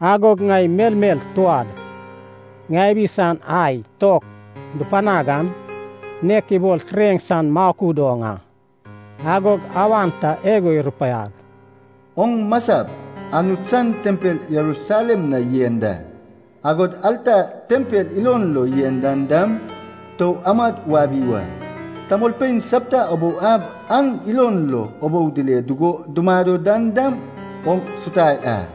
Agog ŋai melmel touad ŋabi san ai tok dupanag an, nek ibol tureŋ san makud oŋ a. Agog awan ta igo irupaiag, “Oŋ masap Anut san tempel Jerusalem na yen da, agod alta tempel ilon lo yen dan dam, tou amad wabi wa. Tamolpein sapta ubou ab an ilon lo ubou dile dugo dumado dan dam oŋ sutai a.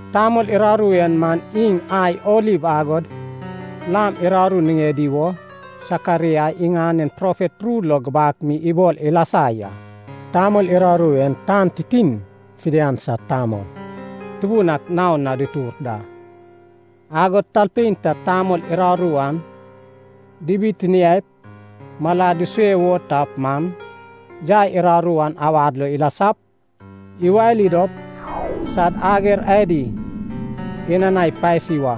Tamol uraru en man iŋ ai oliv agod lam uraru niŋedi wo Sekaraia iŋanen profet ru lo gubak mi ibol ilasa ya. Tamol uraru en tan titin fidian sad Tamol Tubun ak naon na dutur da. Agod talpein ta tamol uraru an dibitiniaip malad dusue wo tap man, yai uraru an awad lo ilasap, iwali dop sad ager adi inanai pasi wa.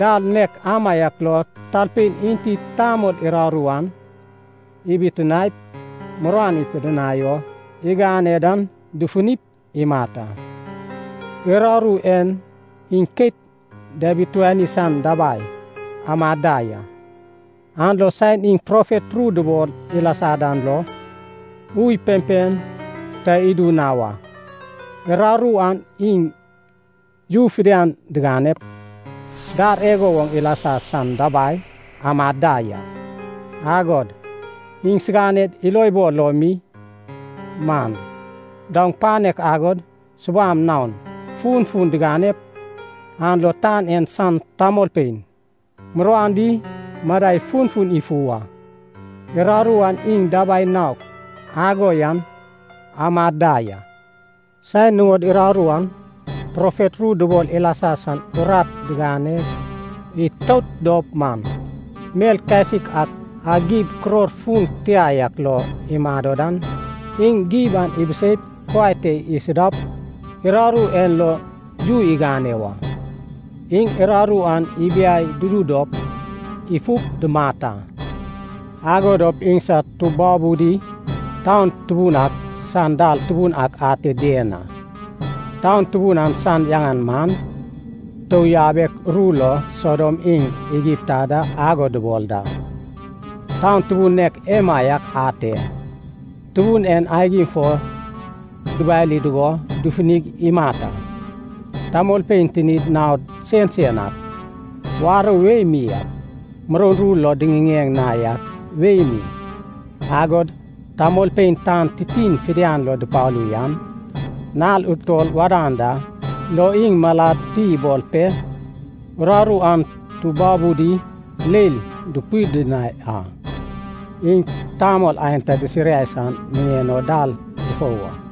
Dal nek amaiak lo talpein enti tamol uraru an ibitiniaip muruan ipidinai o igane dan dufunip imat a. Uraru en iŋ keit diabituani san dabai amad da ya, an lo saen iŋ profet ru dubol ilasa dan lo, ui pempem ta idu na wa. Uraru an iŋ you fidian diganep, dar igo woŋ ilasa san dabai amad da ya. Agod iŋsiganed ilobol lo mi man, daoŋ panek agod subam naon funfun diganep, an lo tan en san tamolpein muruan di madai funfun ifu wa. Uraru an iŋ dabai naok ago yan amad da ya. Saen nuŋod uraru an, profet ru dubol ilasa san urat digane itout dop man, mel kasik ak a gib kuror fun tia yak lo imado dan, iŋ gib an ibiseip kuai te isudap, uraru en lo yu igane wa. Iŋ uraru an ibiai dudu dop ifup dumat a. Ago dop iŋsad tubabudi taun tubun ak san dal tubun ak ate dien a. Taun tubun an san yaŋan man, tou yabek ru lo Sodom iŋ Egipta da ago dubol da, taun tubun nek emaiak ate, Tubun en aigim fo dubali dugo dufunig imat a. Tamolpein tinid naon sensen ak, warou wei mi ak, muroun ru lo diŋiŋeŋ na yak wei mi, agod tamolpein tan titin fidian lo dupalu yan, nal utol wadan da lo iŋ malad ti ibol pe, uraru an tubabudi leil dupidinai a. Iŋ tamol aenta disiriai san niŋen o dal dufou wa.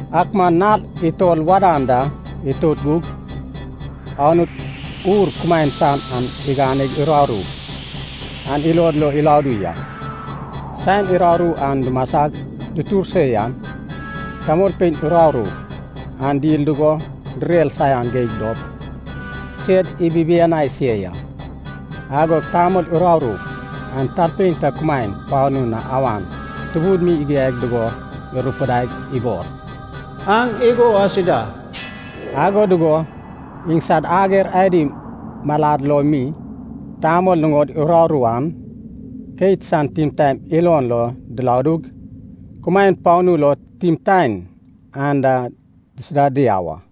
Ak man nal utol wadan da itout gug, Anut ur kumaen san an iganeg uraru an ilod lo iladu ya. Saen uraru an dumasag dutur se yan, tamolpein uraru an dil dugo direr saian geig dop sed ibibianai se ya. Agog tamol uraru an talpein ta kumaen panu na awan tubun mi igiai dugo irupidaig ibol, “Aŋ igo asida!” Ago dugo iŋsad ager adi malad lo mi, tamol nuŋod uraru an, keit san timtaen ilon lo diladug, kumaen panu lo timtaen an da disuda diau a.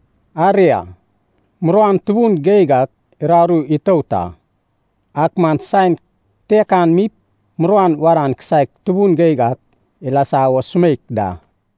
Aria, muruan tubun geig ak uraru itout a. Ak man saen kitekan mip, muruan wadan kisaek tubun geig ak ilasa wo sumeik da.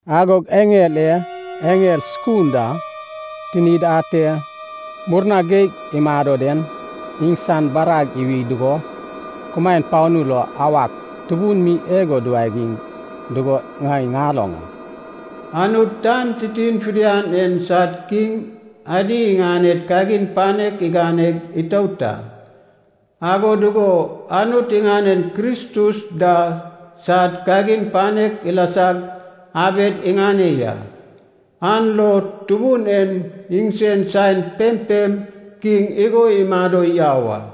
Agog eŋel e eŋel sukunda tinid ate murna geig imado den, iŋsan barag iwi dugo, kumaen panu lo awak tubun mi igo duwagiŋ dugo ŋai ŋaloŋ a. “Anut tan titin fidian en sad kiŋ adi iŋaned kagin panek iganeg itout a, ago dugo Anut iŋanen Kristus da sad kagin panek ilasag abed iŋane ya. An lo Tubun en iŋsen saen pempem kiŋ igo imado yau a.”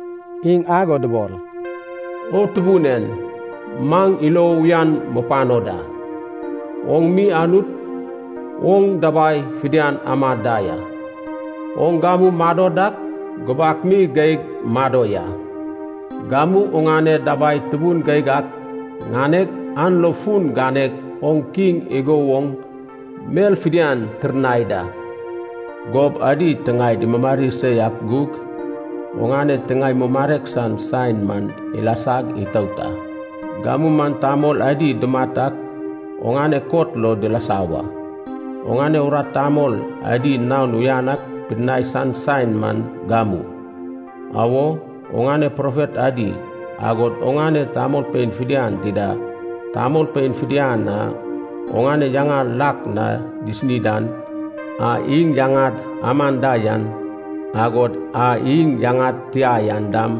Iŋ ago dubol, “O Tubun en, maŋ ilo uyan mupano da. Oŋ mi Anut, oŋ dabai fidian ama da ya. Oŋ gamu mado dak, gubak mi geig mado ya. Gamu oŋane dabai tubun geig ak ŋaneg, an lo fun ganeg oŋ Kiŋ igo woŋ mel fidian tirnai da. Gob adi tiŋaed imumari se yak gug, oŋane tiŋae mumarek san saen man ilasag itout a. Gamu man tamol adi dumat ak oŋane kot lo dilasa wa. Oŋane urat tamol adi naon uyan ak pidinai san saen man gamu. Awo, oŋane profet adi, agod oŋane tamolpein fidian dida, tamolpein fidian a oŋane yaŋa lak na disini dan, a iŋ yaŋad aman da yan, agod a iŋ yaŋad tia yan dam,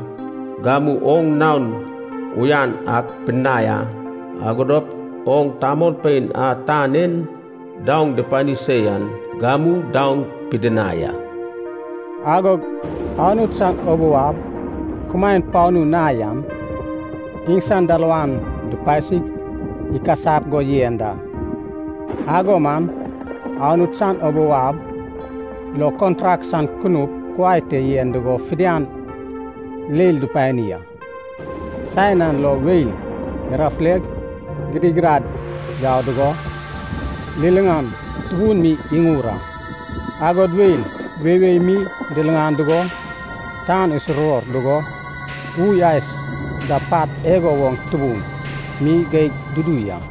gamu oŋ naon uyan ak pidinai a. Ago dop oŋ tamolpein a tan en daoŋ dupani se yan, gamu daoŋ pidinai a.” Agog Anut san ubou ab kumaen panu na yan, iŋsan dalawan dupasig ikasap go yen da. Ago man Anut san ubou ab lo kontrak san kunup kuai te yen dugo fidian leil dupani a. Saen an lo weil irafuleg gidigidad yau dugo, liliŋan tubun mi iŋur a, agod weil weiwei mi diliŋan dugo, tan isuruwor dugo, ui ais da pat igo woŋ tubun mi geig dudu ya.